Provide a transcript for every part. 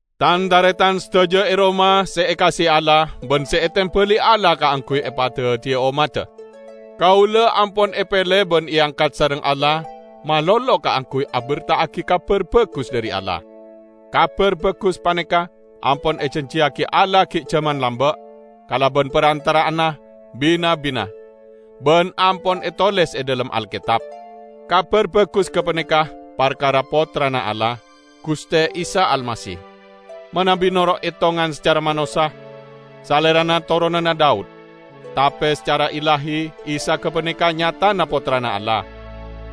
Tan-taretan sadaja e Roma se ekaase'e Allah ban se etembali Allah kaangguy epadaddiya ommadda. Kaula ampon epele ban eangkat sareng Allah malolo kaangguy aberta'agi Kabar Bagus dhari Allah. Kabar Bagus paneka ampon ejanjiyagi Allah gi' jaman lamba' kalaban parantara'anna bi-nabbina, ban ampon etoles e dhalem Alketab. Kabar Bagus gapaneka parkara Pottrana Allah, Guste Isa Almasih. Manabi noro' etongan sacara manossa, Salerana toronanna Daud, tape sacara illahi Isa gapaneka nyatana Pottrana Allah.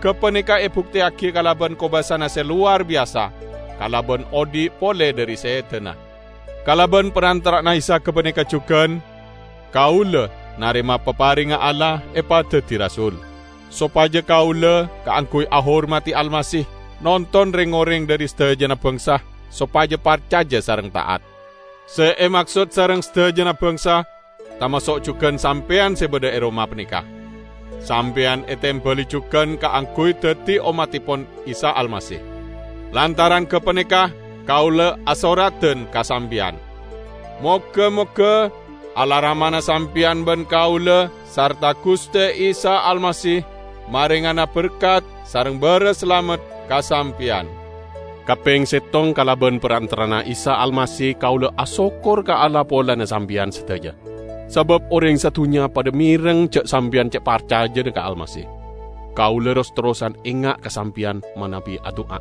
Gapaneka ebukteyagi kalaban kobasana se lowar biyasa kalaban odhi' pole dhari sedana. Kalaban parantara'anna Isa gapaneka jugan kaula narema paparengnga Allah epadaddi rasul, sopaja kaula -- kaangguy ahormadi Almasih -- nonton reng-oreng dhari sadajana bangsa sopaja parcaja sareng ta'at. Se emaksod sareng sadajana bangsa tamaso' jugan sampeyan se badha e Roma paneka. Sampeyan etembali jugan kaangguy daddi ommattepon Isa Almasih. Lantaran gapaneka kaula asoradan ka sampeyan. Moga-moga Allah Ramana sampeyan ban kaula sarta Guste Isa Almasih marengana berkat sareng baras salamet ka sampeyan. Kapeng settong kalaban parantara'anna Isa Almasih kaula asokkor ka Allah polana sampeyan sadaja; sabab oreng sadunnya padha mereng ja' sampeyan ce' parcajana ka Almasih. Kaula ros-terrosan enga' ka sampeyan manabi adu'a.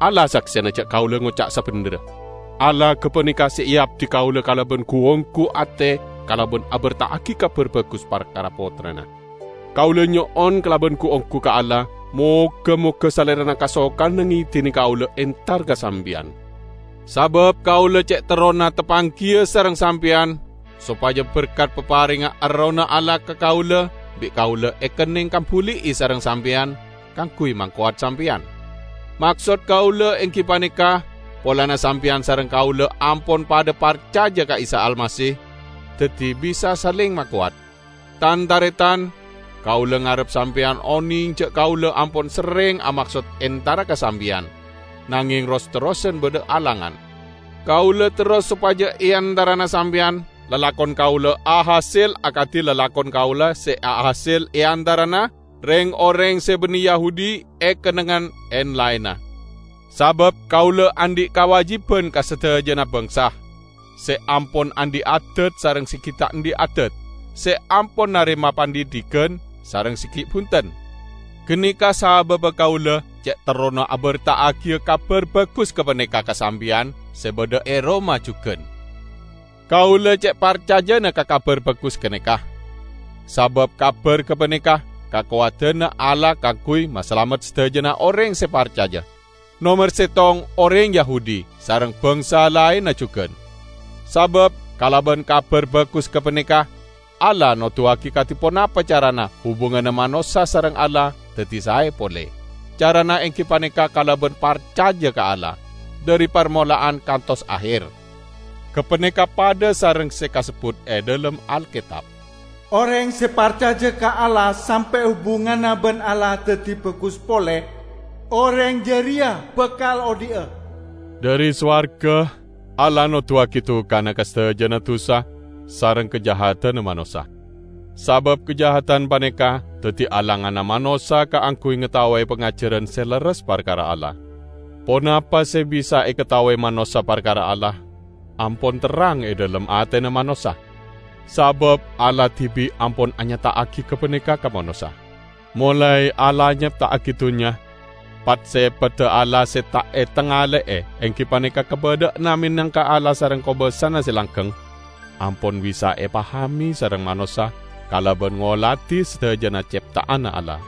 Allah saksena ja' kaula ngoca' sabendherra. Allah gapaneka se eabdi kaula kalaban gu-onggu ate kalaban aberta'agi Kabar Bagus parkara Pottrana. Kaula nyo'on kalaban gu-onggu ka Allah moga-moga Salerana kasokana ngedine kaula entar ka sampeyan. Sabab kaula ce' terrona tapanggiya sareng sampeyan sopaja berkat paparengnga Errohna Allah ka kaula bi' kaula ekenneng kambuli'i sareng sampeyan kaangguy makowat sampeyan. Maksod kaula enggi paneka polana sampeyan sareng kaula ampon padha parcaja ka Isa Almasih, daddi bisa saleng makowat. Tan-taretan! Kaula ngarep sampeyan oneng ja' kaula ampon serreng amaksod entara ka sampeyan, nangeng ros-terrosan badha alangan. Kaula terro sopaja e antarana sampeyan lalakon kaula ahasel akadi lalakon kaula se ahasel e antarana reng-oreng se banne Yahudi e kennengngan en-laenna. Sabab kaula andhi' kawajiban ka sadajana bangsa: se ampon andhi' adad sareng se gi' ta' andhi' adad, se ampon narema pandhidhigan sareng se gi' bunten. Ganeka sababba kaula ce' terrona aberta'agiya Kabar Bagus gapaneka ka sampeyan se badha e Roma jugan. Kaula ce' parcajana ka Kabar Bagus ganeka, sabab kabar gapaneka kakowadanna Allah kaangguy masalamet sadajana oreng se parcaja: nomer settong oreng Yahudi, sareng bangsa laenna jugan. Sabab kalaban Kabar Bagus gapaneka Allah noduwagi kadi ponapa carana hubunganna manossa sareng Allah daddi sae pole; carana enggi paneka kalaban parcaja ka Allah, dhari parmola'an kantos aher. Gapaneka padha sareng se kasebbut e dhalem Alketab, "Oreng se parcaja ka Allah sampe' hubunganna ban Allah daddi bagus pole, oreng jareya bakal odhi'a." Dhari sowarga Allah noduwagi dukana ka sadajana dusa sareng kajahadanna manossa, sabab kajahadan paneka daddi alanganna manossa kaangguy ngataowe pangajaran se lerres parkara Allah. Ponapa se bisa ekataowe manossa parkara Allah ampon terrang e dhalem atena manossa, sabab Allah dibi' ampon anyata'agi gapaneka ka manossa. Molae Allah nyepta'agi dunnya, pat-sepadda Allah se ta' etangale'e enggi paneka kabadha'anna menangka Allah sareng kobasana se langgeng, ampon bisa epahame sareng manossa kalaban ngoladi sadajana cepta'anna Allah.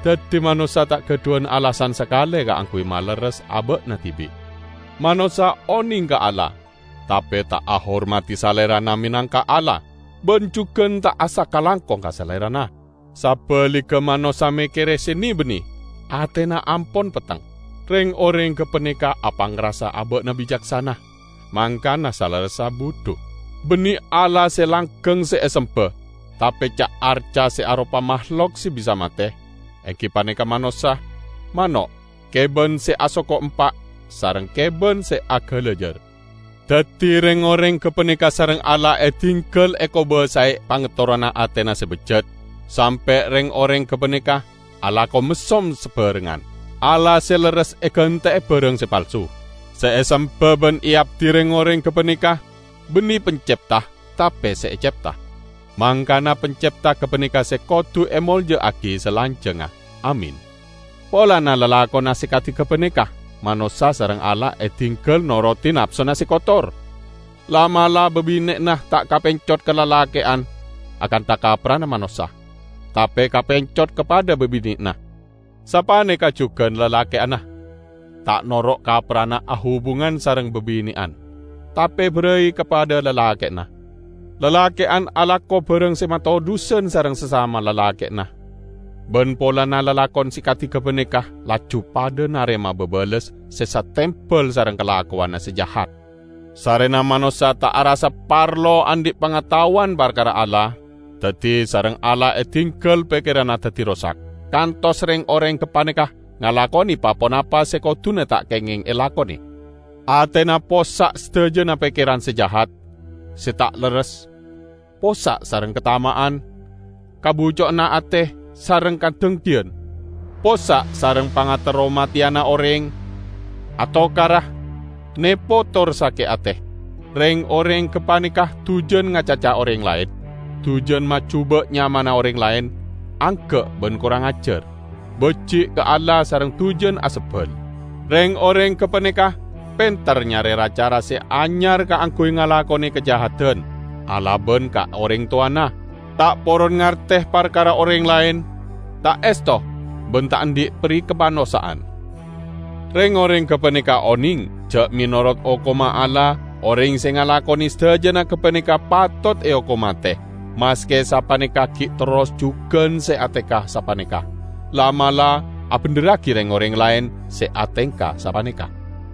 Daddi manossa ta' gadhuwan alasan sakale kaangguy malerres aba'na dibi'. Manossa oneng ka Allah tape ta' ahormadi Salerana menangka Allah ban jugan ta' asakalangkong ka Salerana. Sabaligga manossa mekkere se ne-banne; atena ampon petteng. Reng-oreng gapaneka apangrasa aba'na bicaksana, mangkana salerressa budhu. Banne Allah se langgeng se esemba, tape ca-arca se aropa mahlok se bisa mate; enggi paneka manossa, mano', keban se asoko empa' sareng keban se agalajar. Daddi reng-oreng gapaneka sareng Allah edinggal ekobasae pangaterrona atena se bejjat, sampe' reng-oreng gapaneka alako messom sabarengngan. Allah se lerres egante'e barang se palsu. Se esemba ban eabdi reng-oreng gapaneka banne Pancepta tape se ecepta. Mangkana Pancepta gapaneka se kodu emolja'agi salanjangnga! Amin. Polana lalakonna se kadi gapaneka, manossa sareng Allah edinggal norodi napsona se kotor. La'-mala' babine'anna ta' kapencot ka lalake'an akantha kapprana manossa, tape kapencot ka padha babine'anna. Sapaneka jugan lalake'anna; ta' noro' kapprana ahubungan sareng babine'an, tape barai ka padha lalake'anna. Lalake'an alako barang se matodhusan sareng sasama lalake'anna, ban polana lalakon se kadi gapaneka laju padha narema babales se satembal sareng kalakowanna se jahat. Sarrena manossa ta' arassa parlo andhi' pangataowan parkara Allah, daddi sareng Allah edinggal pekkeranna daddi rosak, kantos reng-oreng gapaneka ngalakone pa-ponapa se koduna ta' kengeng elakone. Atena possa' sadajana pekkeran se jahat, se ta' lerres, possa' sareng katama'an, kabucco'anna ate sareng kadenggiyan; possa' sareng pangaterro mateyana oreng, atokara, nepo tor sake' ate. Reng-oreng gapaneka dujan ngacaca oreng laen, dujan majuba' nyamana oreng laen; angga' ban korang ajar, baji' ka Allah sareng dujan asebbal. Reng-oreng gapaneka penter nyare ra-cara se anyar kaangguy ngalakone kajahadan; alaban ka oreng towana; ta' poron ngarte parkara oreng laen; ta' esto ban ta' andhi' perikamanossa'an. Reng-oreng gapaneka oneng, ja' menorot hokomma Allah, oreng se ngalakone sadajana gapaneka patot eokom mate. Maske sapaneka gi' terros jugan se atengka sapaneka; la'-mala' abendherragi reng-oreng laen se atengka sapaneka.